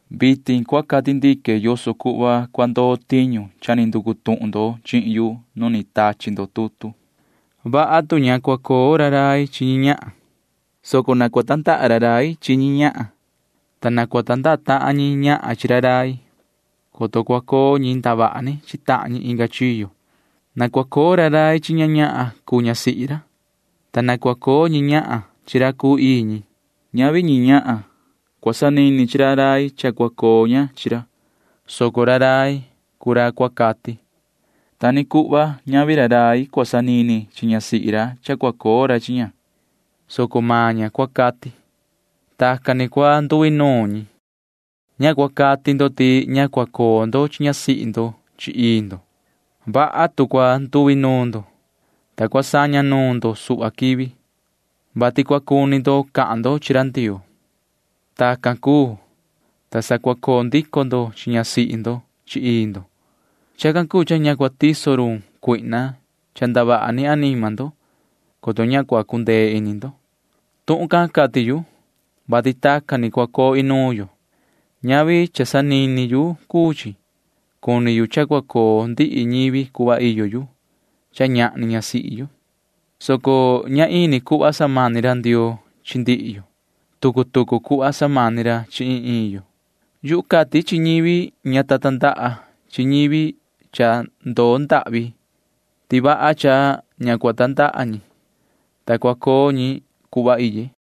Vitin cua cati ndique yoso cuhva cua ndoo tiñu cha ni nducu tuhun ndo chihin yu nu ni tachi ndo tutu. Vaha tu ña cua coo ra rai chi ñi ñahan, soco na cua tandaha ra rai chi ñi ñahan, ta na cua tandaha tahan ñi ñahan chi ra rai, coto cua coo ñi ndavaha ni chi tahan ñi inga chiyo. Na cua coo ra rai chi ña cuu ñasihi ra, ta na cua coo ñi ñahan chi ra cuu ii ñi. Ñavi ñi ñahan cua sanini chi ra rai cha cua coo ña chi ra, soco ra rai cuu ra cua cati. Ta ni cuhva ñavi ra rai cua sanini chi ñasihi ra cha cua coo ra chi ña, soco maan ña cua cati. [Tacan ni cua nduinuun ñi.] Ña cua cati ndo ti ña cua coo ndo chi ñasihi ndo chi ii ndo. Vaha tu cua nduinuun ndo, ta cua saña nuun ndo suhva quivi, vati cua cuni ndo cahan ndo chi ra Ndioo. Tacan cuu, ta sa cua coo ndico ndo chi ñasihi ndo chi ii ndo. Chacan cuu cha ña cua cuu tiso run Satanaa cha ndavaha ni anima ndo, coto ña cua cundee ini ndo. Tuhun can cati yu, vati tacan ni cua coo inuun yo. Ñavi cha sanini yu cuu chi. Cuni yu cha cua coo ndihi ñivi cuhva iyo yu cha ñahni ñasihi yu, soco ña ini cuhva samani ra Ndioo chi ndihi yo. Tucu tucu cuhva samani ra chi iin iin yo. Yuhu cati chi ñivi ña ta tandaha chi ñivi cha ndoo ndahvi ti vaha cha ña cua tandaha ñi, ta cua coo ñi cuhva iye,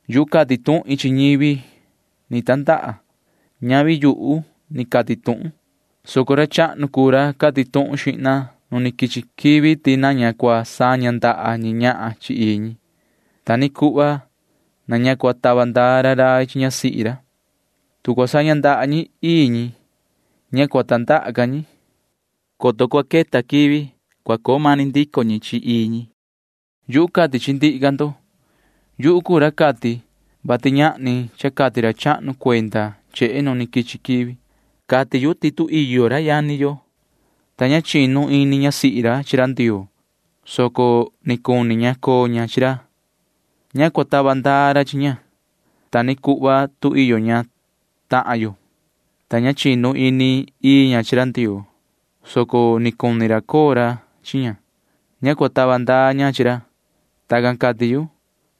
Yuhu cati tuhin chi ñivi ni tandaha. Ñavi yuhu ni cati tuhun, soco ra chahnu cuu ra cati tuhun xihna nu ni quichi quivi ti na ña cua saña ndaha ñi ñahan chi ii ñi. Ta ni cuhva na ña cua tava ndaa ra rai chi ñasihi ra. Tu cua saña ndaha ñi chi ii ñi, ña cua tandaha ca ñi. [Vasi cua queta quivi] cua coo mani ndico ñi chi ii ñi. Yuhu cati chi ndihi ca ndo. Yuhu cuu ra cati, vati ñahni cha cati ra chahnu cuenda chehe nu ni quichi quivi. Cati yu ti tu iyo ra yani yo, ta ña chinu ini ñasihi ra chi ra Ndioo, soco ni cuni ña coo ña chi ra, ña cua tava ndaa ra chi ña. Ta ni cuhva tu iyo ña tahan yo, ta ña chinu ini ii ña chi ra Ndioo, soco ni cuni ra coo ra chi ña, ña cua tava ndaa ña chi ra. Tacan cati yu,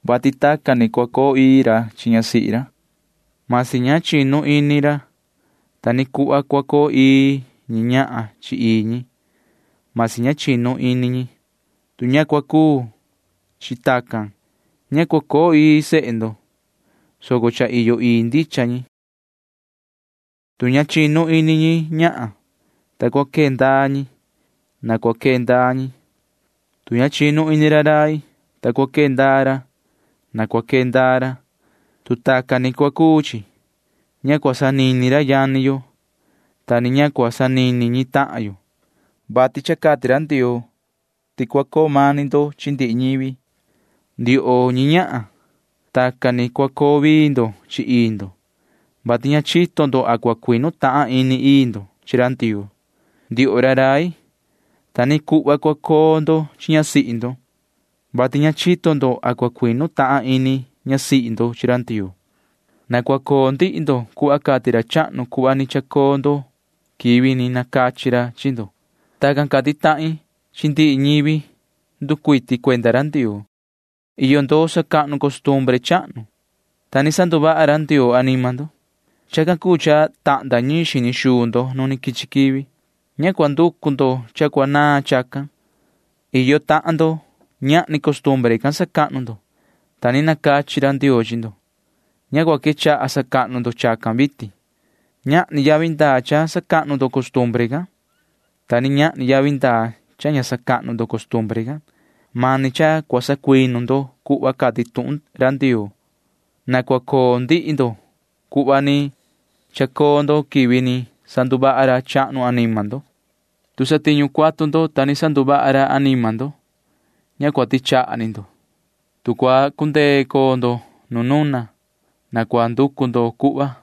vati tacan ni cua coo ii ra chi ñasihi ra, masi ña chinu ini ra. Ta ni cuhva cua coo ii ñi ñahan chi ii ñi, masi ña chinu ini ñi. Tu ña cua cuu chi tacan, ña cua coo ii sehe ndo, soco cha iyo ii ndicha ñi. Tu ña chinu ini ñi ñahan, ta cua quee ndaa ñi, na cua quee ndaa ñi. Tu ña chinu ini ra rai, ta cua quee ndaa ra, na cua quee ndaa ra. Tu tacan ni cua cuu chi, ña cua sanini ra yani yo, ta ni ña cua sanini ñi tahan yo, vati cha cati ra Ndioo ti cua coo mani ndo chi ndihi ñivi. Ndioho ñi ñahan, tacan ni cua coo vii ndo chi ii ndo, vati ña chito ndo a cua cuinu tahan ini ii ndo chi ra Ndioo. Ndioho ra rai, ta ni cuhva cua coo ndo chi ñasihi ndo, vati ña chito ndo a cua cuinu tahan ini ñasihi ndo chi ra Ndioo. Na cua coo ndihi ndo cuhva cati ra chahnu cuhva ni chacoo ndo quivi ni nacachi ra chi ndo. Tacan cati tahin chi ndihi ñivi nducuiti cuenda ra Ndioo. Iyo ndo sacahnu costumbre chahnu, ta ni sanduvaha ra Ndioo anima ndo. Chacan cuu cha tahnda ñiin xini xuu ndo nu quichi quivi. Ña cua nducu ndo cha cua naan chacan. Iyo tahan ndo―ñahni costumbre can sacahnu ndo, ta ni nacachi ra Ndioo chi ndo. Ña cua quechaha sacahnu ndo chacan vitin. Ñahni yavi ndaa cha sacahnu ndo costumbre can, ta ni ñahni yavi ndaa cha ña sacahnu ndo costumbre can. Mani cha cua sacuinu ndo cuhva cati tuhun ra Ndioo. Na cua coo ndihi ndo cuhva ni chacoo ndo quivi ni sanduvaha ra chahnu anima ndo. Tu satiñu cuatu ndo, ta ni sanduvaha ra anima ndo, ña cua tichaha ni ndo. Tu cua cundee coo ndo nu nuna, na cua nducu ndo cuhva.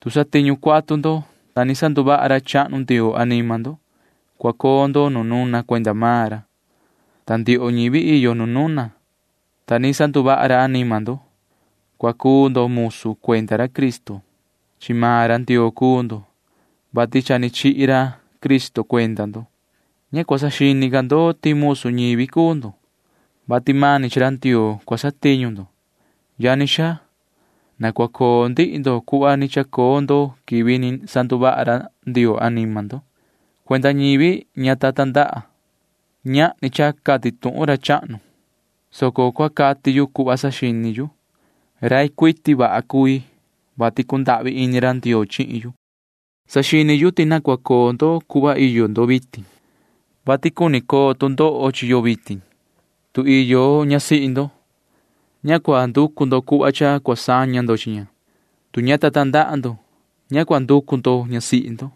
Tu satiñu cuatu ndo, ta ni sanduvaha ra chahnu Ndioo anima ndo, cua coo ndo nu nuna cuenda maan ra. Ta ndioho ñivi iyo nu nuna, ta ni sanduvaha ra anima ndo―cua cuu ndo musu cuenda ra Cristo. Chi maan ra Ndioo cuu ndo, vati cha ni chihi ra Cristo cuenda ndo. Ña cua saxini ca ndo ti musu ñivi cuu ndo, [vati mani chi ra Ndioo cua satiñu ndo]. Yani xaa, na cua coo ndihi ndo cuhva ni chacoo ndo quivi ni sanduvaha ra Ndioo anima ndo. Cuenda ñivi ña ta tandaha―ñahni cha cati tuhun ra chahnu, soco cua cati yu cuhva saxini yu. Rai cuiti vaha cui, vati cundahvi ini ra Ndioo chihin yu. Saxini yu ti na cua coo ndo cuhva iyo ndo vitin, vati cuni coo tu ndoho chi yo vitin. Tu iyo ñasihi ndo, ña cua nducu ndo cuhva cha cua saña ndo chi ña. Tu ña ta tandaha ndo, ña cua nducu ndo ñasihi ndo.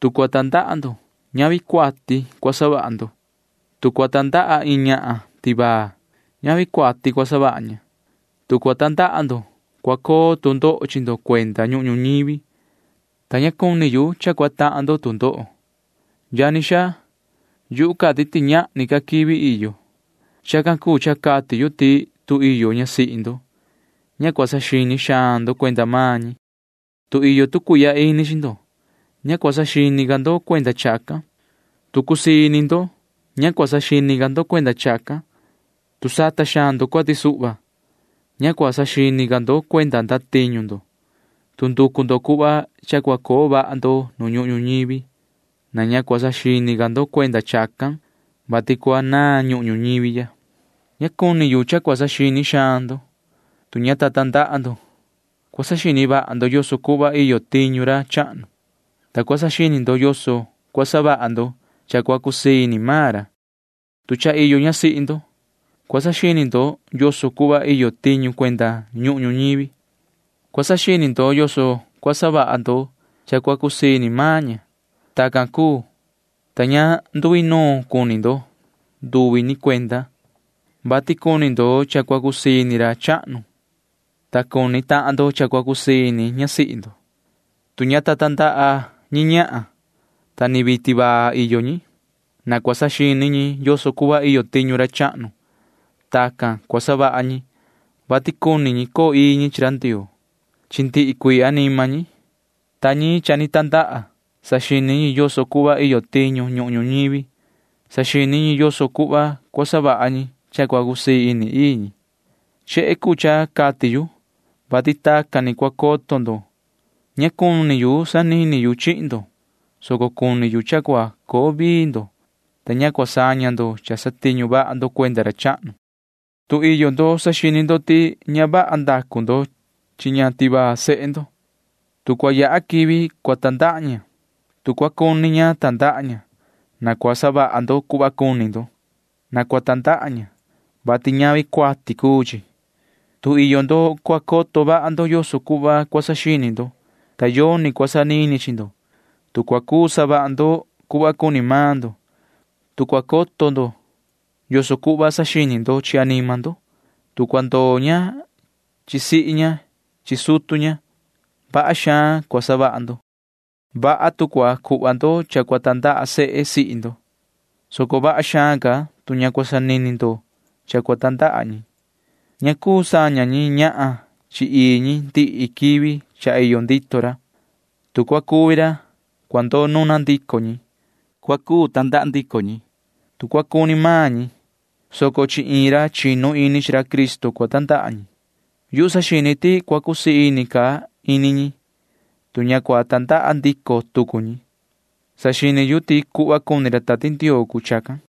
Tu cua tandaha ndo, ñavi cuati cua savaha ndo. Tu cua tandaha iin ñahan tivaa, ñavi cuati cua savaha ña. Tu cua tandaha ndo, cua coo tu ndoho chi ndo cuenda ñuhun ñuñivi, ta ña cuni yu cha cua tahan ndo tu ndoho. Yani xaa, yu cati ti ñahni ca quivi iyo. Chacan cuu cha cati yu ti tu iyo ñasihi ndo, ña cua saxini xaan ndo cuenda maan ñi. Tu iyo tu cuihya ini chi ndo, ña cua saxini ca ndo cuenda chacan. Tu cusii ini ndo, ña cua saxini ca ndo cuenda chacan. Tu sata xaan ndo cuati suhva, ña cua saxini ca ndo cuenda ndatiñu ndo. Tu nducu ndo cuhva cha cua coo vaha ndo nu ñuhun ñuñivi, na ña cua saxini ca ndo cuenda chacan, vati cua naan ñuhun ñuñivi ya. Ña cuni yu cha cua saxini xaan ndo. Tu ña ta tandaha ndo, cua saxini vaha ndo yoso cuhva iyo tiñu ra chahnu, ta cua saxini ndo yoso cua savaha ndo cha cua cusii ini maan ra. Tu cha iyo ñasihi ndo, cua saxini ndo yoso cuhva iyo tiñu cuenda ñuhun ñuñivi. Cua saxini ndo yoso cua savaha ndo cha cua cusii ini maan ña. Tacan cuu, ta ña nduinuun cuni ndo nduvi ni cuenda, [vati cuni ndo cha cua cusii ini ra chahnu, ta cuni tahan ndo cha cua cusii ini ñasihi ndo]. Tu ña ta tandaha ñi ñahan, ta ni vii tivaa iyo ñi, mani cua saxini ñi yoso cuhva iyo tiñu ra chahnu. Tacan cua savaha ñi, vati cuni ñi coo ii ñi chi ra Ndioo chi ndihi cuii anima ñi, ta ñi cha ni tandaha―saxini ñi yoso cuhva iyo tiñu ñuhun ñuñivi. Saxini ñi yoso cuhva cua savaha ñi cha cua cusii ini ii ñi. Chehe cuu cha cati yu, vati tacan ni cua coto ndo. Ña cuni yu sanini yu chihin ndo, soco cuni yu cha cua coo vii ndo, ta ña cua saña ndo cha satiñu vaha ndo cuenda ra chahnu. Tu iyo ndo saxini ndo ti ña vaha ndacu ndo chi ña tivaa sehe ndo, tu cua yaha quivi cua tandaha ña, tu cua cuni ña tandaha ña, na cua savaha ndo cuhva cuni ndo. Na cua tandaha ña, vati ñavi cuati cuu chi. Tu iyo ndo cua coto vaha ndo yoso cuhva cua saxini ndo, ta yoni cua sanini chi ndo, tu cua cuu savaha ndo cuhva cuni maan ndo, tu cua coto ndo yoso cuhva saxini ndo chi anima ndo, tu cua ndoo ña chi sihi ña chi sutu ña, vaha xaan cua savaha ndo. Vaha tu cua cuhva ndo cha cua tandaha sehe sihi ndo, soco vaha xaan ca tu ña cua sanini ndo cha cua tandaha ñi. Ña cuu saña ñi ñahan chi ii ñi ndihi quivi cha iyo ndito ra. Tu cua cuvi ra, cua ndoo nuna ndico ñi. Cua cuu tandaha ndico ñi, tu cua cuni maan ñi, soco chi iin ra chinu ini chi ra Cristo cua tandaha ñi. Yuhu saxini ti cua cusii ca ini ñi, tu ña cua tandaha ndico tucu ñi. Saxini yu ti cuhva cuni ra Tati Ndioo cuu chacan.